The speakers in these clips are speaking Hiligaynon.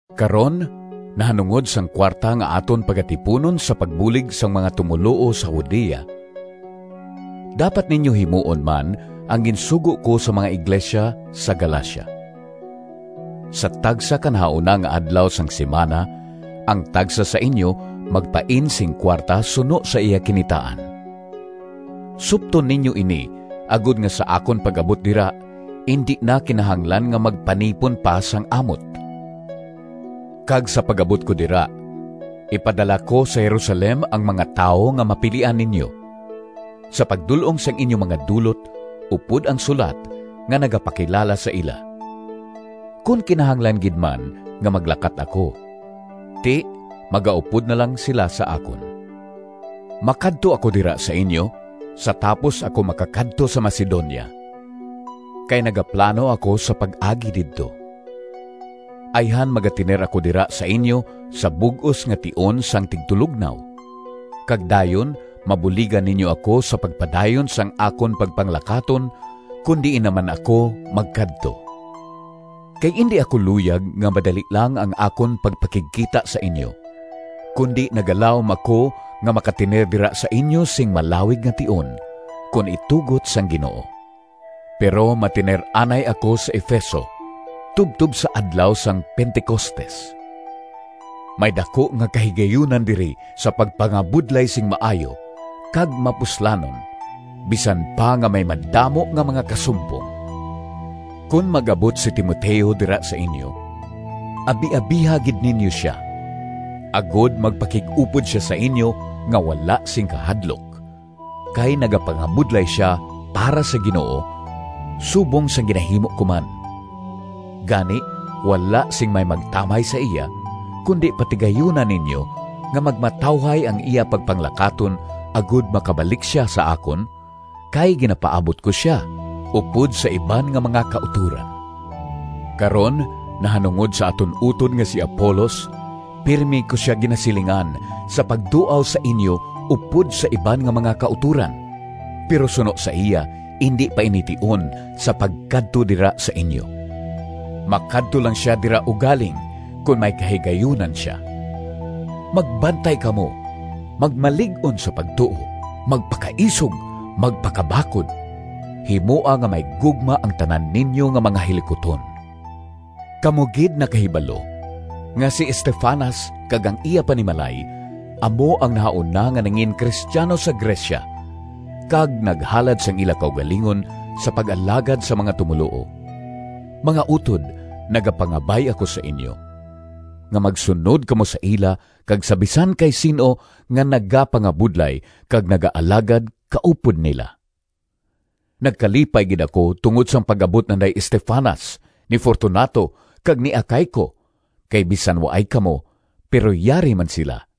Karon nahanungod sang kuwarta nga aton pagatipunon sa pagbulig sang mga tumoluo sa Judea, dapat ninyo himuon man ang ginsugo ko sa mga iglesia sa Galacia. Sa tagsa ka nahauna nga adlaw sang simana ang tagsa sa inyo magpain sing kuwarta suno sa iya kinitaan. Supton ninyo ini agod nga sa akon pag-abot dira indi na kinahanglan nga magpanipon pa sang amot. Kag sa pag-abot ko dira, ipadala ko sa Jerusalem ang mga tawo nga mapilian ninyo, sa pagdul-ong sang inyo mga dulot upod ang sulat nga nagapakilala sa ila. Kon kinahanglan gid man nga maglakat ako, ti, magaupod na lang sila sa akon. Makadto ako dira sa inyo sa tapos ako makakadto sa Macedonia, kay nagaplano ako sa pag-agi didto. Ayhan magatener ako dira sa inyo sa bug-os nga tion sang tigtulognaw, kag dayon mabuligan ninyo ako sa pagpadayon sang akon pagpanglakaton kon diin naman ako magkadto. Kay indi ako luyag nga madali lang ang akon pagpakigkita sa inyo, kundi nagalaom ako nga makatener dira sa inyo sing malawig nga tion, kon itugot sang Ginoo. Pero matener anay ako sa Efeso tubtob sa adlaw sang Pentecostes. May daku nga kahigayunan diri sa pagpangabudlay sing maayo kag mapuslanon bisan pa nga may madamo nga mga kasumpong. Kon mag-abot si Timoteo dira sa inyo, abiabiha gid ninyo sia, agod magpakig-upod sia sa inyo nga wala sing kahadlok, kay nagapangabudlay sia para sa Ginoo subong sang ginahimo ko man. Gani wala sing may magtamay sa iya, kundi patigayuna ninyo nga magmatawhay ang iya pagpanglakaton, agod makabalik sia sa akon, kay ginapaabot ko sia upod sa iban nga mga kautoran. Karon, nahanungod sa aton utod nga si Apolos, pirme ko sia ginasilingan sa pagduaw sa inyo upod sa iban nga mga kautoran, pero suno sa iya indi pa ini tion sa pagkadto dira sa inyo. Makadto lang sia dira ugaling kon may kahigayunan sia. Magbantay kamo, magmalig-on sa pagtuo, magpakaisog, magpakabakod. Himoa nga may gugma ang tanan ninyo nga mga hilikuton. Kamo gid nakahibalo nga si Estefanas kag ang iya panimalay amo ang nahauna nga nangin-cristiano sa Grecia kag naghalad sang ila kaugalingon sa pag-alagad sa mga tumoluo. Mga utod, nagapangabay ako sa inyo, nga magsunod kamo sa ila kag sa bisan kay sin-o nga nagapangabudlay kag nagaalagad kaupod nila. Nagkalipay gid ako tungod sang pag-abot nanday Estefanas, ni Fortunato kag ni Acaico, kay bisan waay kamo, pero yari man sila.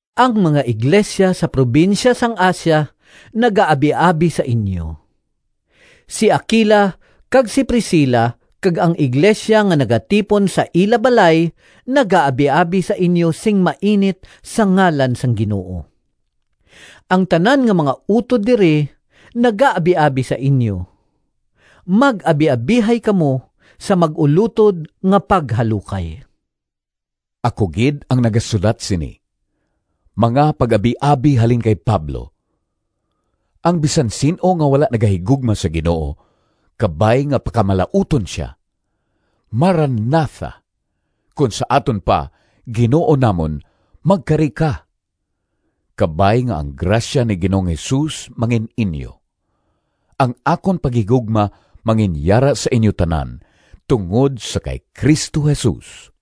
Ang mga iglesia sa probinsya sang Asia nagaabiabi sa inyo. Si Aquila kag si Priscila kag ang iglesia nga nagatipon sa ila balay nagaabiabi sa inyo sing mainit sa ngalan sang Ginoo. Ang tanan nga mga utod diri nagaabiabi sa inyo. Mag-abiabihay kamo sa mag-ulotod nga paghalukay. Ako gid ang nagasulat sini: Mga pag-abiabi halin kay Pablo. Ang bisan sin-o nga wala nagahigugma sa Ginoo, kabay nga pakamalauton sia! Marana tha! Kon sa aton pa, Ginoo namon, magkari ka! Kabay nga ang grasya ni Ginoong Jesus mangin-inyo. Ang akon paghigugma manginyara sa inyo tanan tungod sa kay Cristo Jesus.